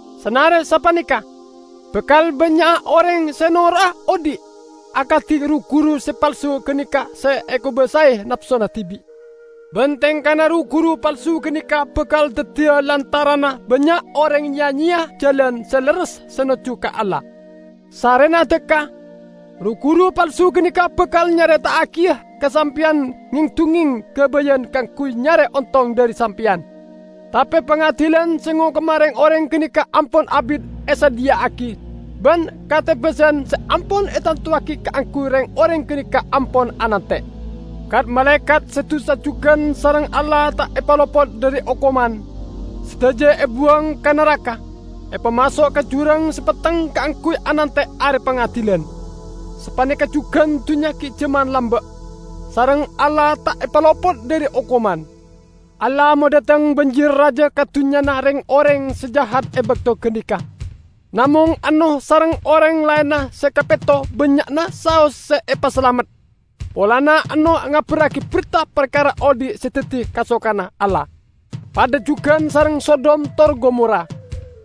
Sanare sapaneka, bakal bannya'a oreng se noro'a odhi' akadi ru-guru se palsu ganeka se ekobasae napsona dibi'. Ban tengkana ru-guru palsu ganeka bakal daddiya lantaranna bannya' oreng ya-nyeya Jalan Se Lerres se nojju ka Allah. Sarrena dhakka, ru-guru palsu ganeka bakal nyareta'agiya ka sampeyan ngeng-dungngeng gabayan kaangguy nyare ontong dhari sampeyan. Tape pangadilan se ngokoma reng-oreng ganeka ampon abit esadhiya'agi, ban katebasan se ampon etantowagi kaangguy reng-oreng ganeka ampon anante'. Kat-malaekat se dusa jugan sareng Allah ta' epalopot dhari okoman; sadaja ebuwang ka naraka, epamaso' ka jurang se petteng kaangguy anante' Are Pangadilan. Sapaneka jugan dunnya gi' jaman lamba', sareng Allah ta' epalopot dhari okoman. Allah madhateng banjir raja ka dunnyana reng-oreng se jahat e bakto ganeka. Namong Ennoh sareng oreng laenna se kapetto bannya'na saos se epasalamet, polana Ennoh ngabarragi berta parkara odhi' se daddi kasokanna Allah. Padha jugan sareng Sodom tor Gomora: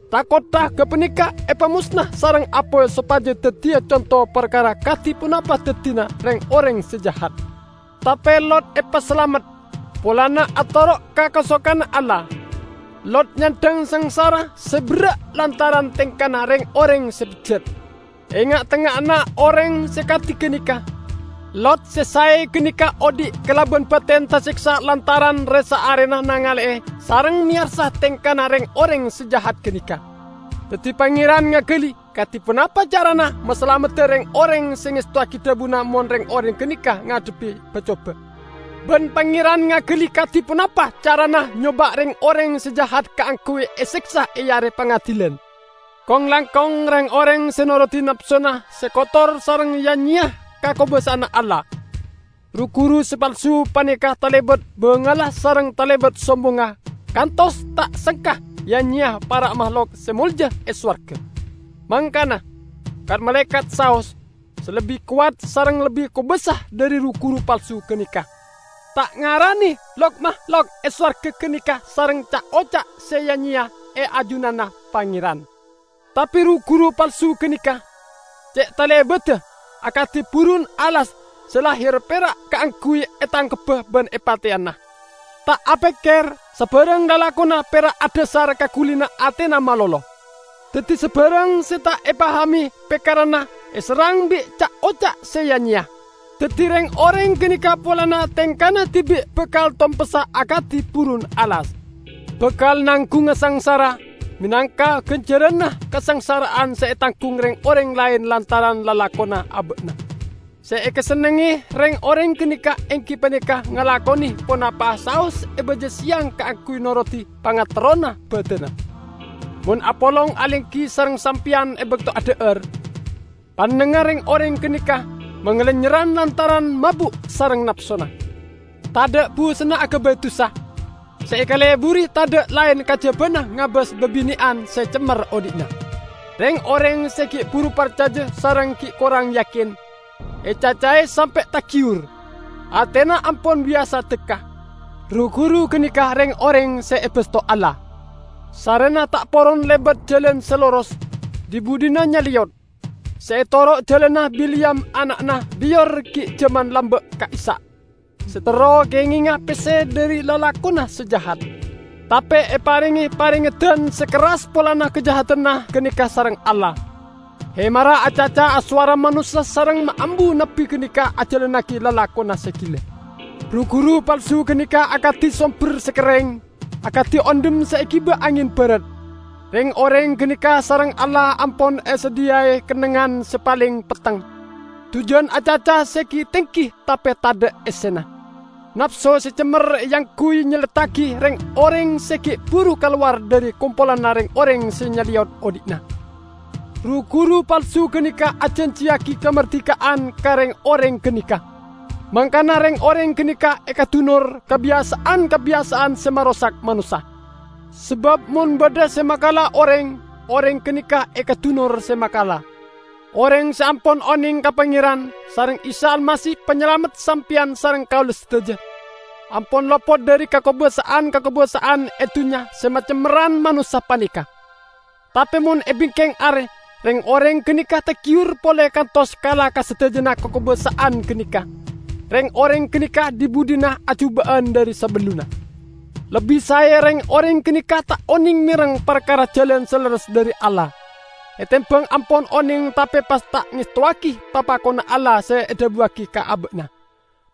tha-kottha gapaneka epamosna sareng apoy sopaja daddiya conto parkara kadi ponapa daddina reng-oreng se jahat. Tape Lot epasalamet, polana atoro' ka kasokanna Allah; Lot nyandhang sangsara se berra' lantaran tengkana reng-oreng se bejjat. E nga'-tengnga'anna oreng se kadi ganeka, Lot se sae ganeka odhi' kalaban baten taseksa lantaran re-saarena nengale sareng meyarsa tengkana reng-oreng se jahat ganeka. Daddi Pangeran ngagali kadi ponapa carana masalamedda reng-oreng se ngestowagi dhabuna mon reng-oreng ganeka ngadhebbi ba-coba. Ban Pangeran ngagali kadi ponapa carana nyoba' reng-oreng se jahat kaangguy eseksa e Are Pangadilan, kong-langkong reng-oreng se norodi napsona se kotor sareng ya-nyeya ka kakobasa'anna Allah. Ru-guru se palsu paneka talebat bangalla sareng talebat sombongnga kantos ta' sengka ya-nyeya para mahlok se molja e sowarga! Mangkana, kat-malaekat saos, se lebbi kowat sareng lebbi kobasa dhari ru-guru palsu ganeka, ta' ngarane lok-mahlok e sowarga ganeka sareng ca'-oca' se ya-nyeya e ajunanna Pangeran. Tape ru-guru palsu ganeka, ce' talebadda! Akadi burun alas se lahir pera' kaangguy etangkebba ban epateyana. Ta' apekker, sabarang lalakonna pera' adhasar ka gulina atena malolo. Daddi sabarang se ta' epahame pekkeranna eserrang bi' ca'-oca' se ya-nyeya. Daddi reng-oreng ganeka polana tengkana dibi' bakal tompessa akadi burun alas. Bakal nanggunga sangsara menangka ganjaranna kasangsara'an se etanggung reng-oreng laen lantaran lalakonna aba'na. Se ekasennengnge reng-oreng ganeka enggi paneka ngalakone ponapa'a saos e baja seyang kaangguy norodi pangaterrona badanna. Mon apolong alenggi sareng sampeyan e bakto adha'ar, pannengnga reng-oreng ganeka mangalennyerran lantaran mabu' sareng napsona. Tadha' busenna agabay dusa. Se ekaleburi tadha' laen kajabana ngabas babine'an se cemmer odhi'na. Reng-oreng se gi' buru parcaja sareng gi' korang yakin, ecacae sampe' tagiyur. Atena ampon biyasa dhakka. Ru-guru ganeka reng-oreng se ebasto Allah! Sarrena ta' poron lebat jalan se loros, dhi-budhina nyaleyot. Se etoro' jalanna Bileyam ana'na Beyor gi' jaman lamba' ka'issa', se terro kengenga pesse dhari lalakonna se jahat. Tape eparenge parengeddan se kerras polana kajahadanna ganeka sareng Allah; hemarra acaca asowara manossa sareng maambu nabbi ganeka ajalannagi lalakonna se gila. Ru-guru palsu ganeka akadi somber se kerreng, akadi ondhem se egiba angen barat. Reng-oreng ganeka sareng Allah ampon esadhiyai kennengngan se paleng petteng. Dujan acaca se gi-tenggi tape tadha' essena; napso se cemmer eangguy nyelleddagi reng-oreng se gi' buru kalowar dhari kompolanna reng-oreng se nyaleyot odhi'na. Ru-guru palsu ganeka ajanjiyagi kamardika'an ka reng-oreng ganeka, mangkana reng-oreng ganeka ekadunor kabiyasa'an-kabiyasa'an se marosak manossa. Sabab mon badha se makala oreng, oreng ganeka ekadunor se makala. Oreng se ampon oneng ka Pangeran sareng Isa Almasih Panyalamedda sampeyan sareng kaula sadaja, ampon lopot dhari kakobasa'an-kakobasa'an e dunnya se macemmerran manossa paneka. Tape mon e bingkeng are reng-oreng ganeka tagiyur pole kantos kala ka sadajana kakobasa'an ganeka, reng-oreng ganeka dhi-budhina ajuba'an dhari sabellunna. Lebbi sae reng-oreng ganeka ta' oneng mereng parkara jalan se lerres dhari Allah, etembang ampon oneng tape pas ta' ngestowagi papakonna Allah se edhabuwagi ka aba'na.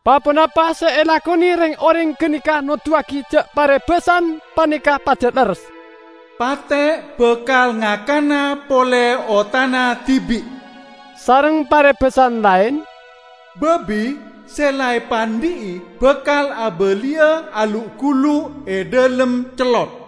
Pa-ponapa se elakone reng-oreng ganeka noduwagi ja' parebasan paneka pajat lerres: "Pate' bakal ngakana pole otana dibi'," sareng parebasan laen, "Babi se la epandhi'i bakal abaliya alu'-gulu' e dhalem cellot."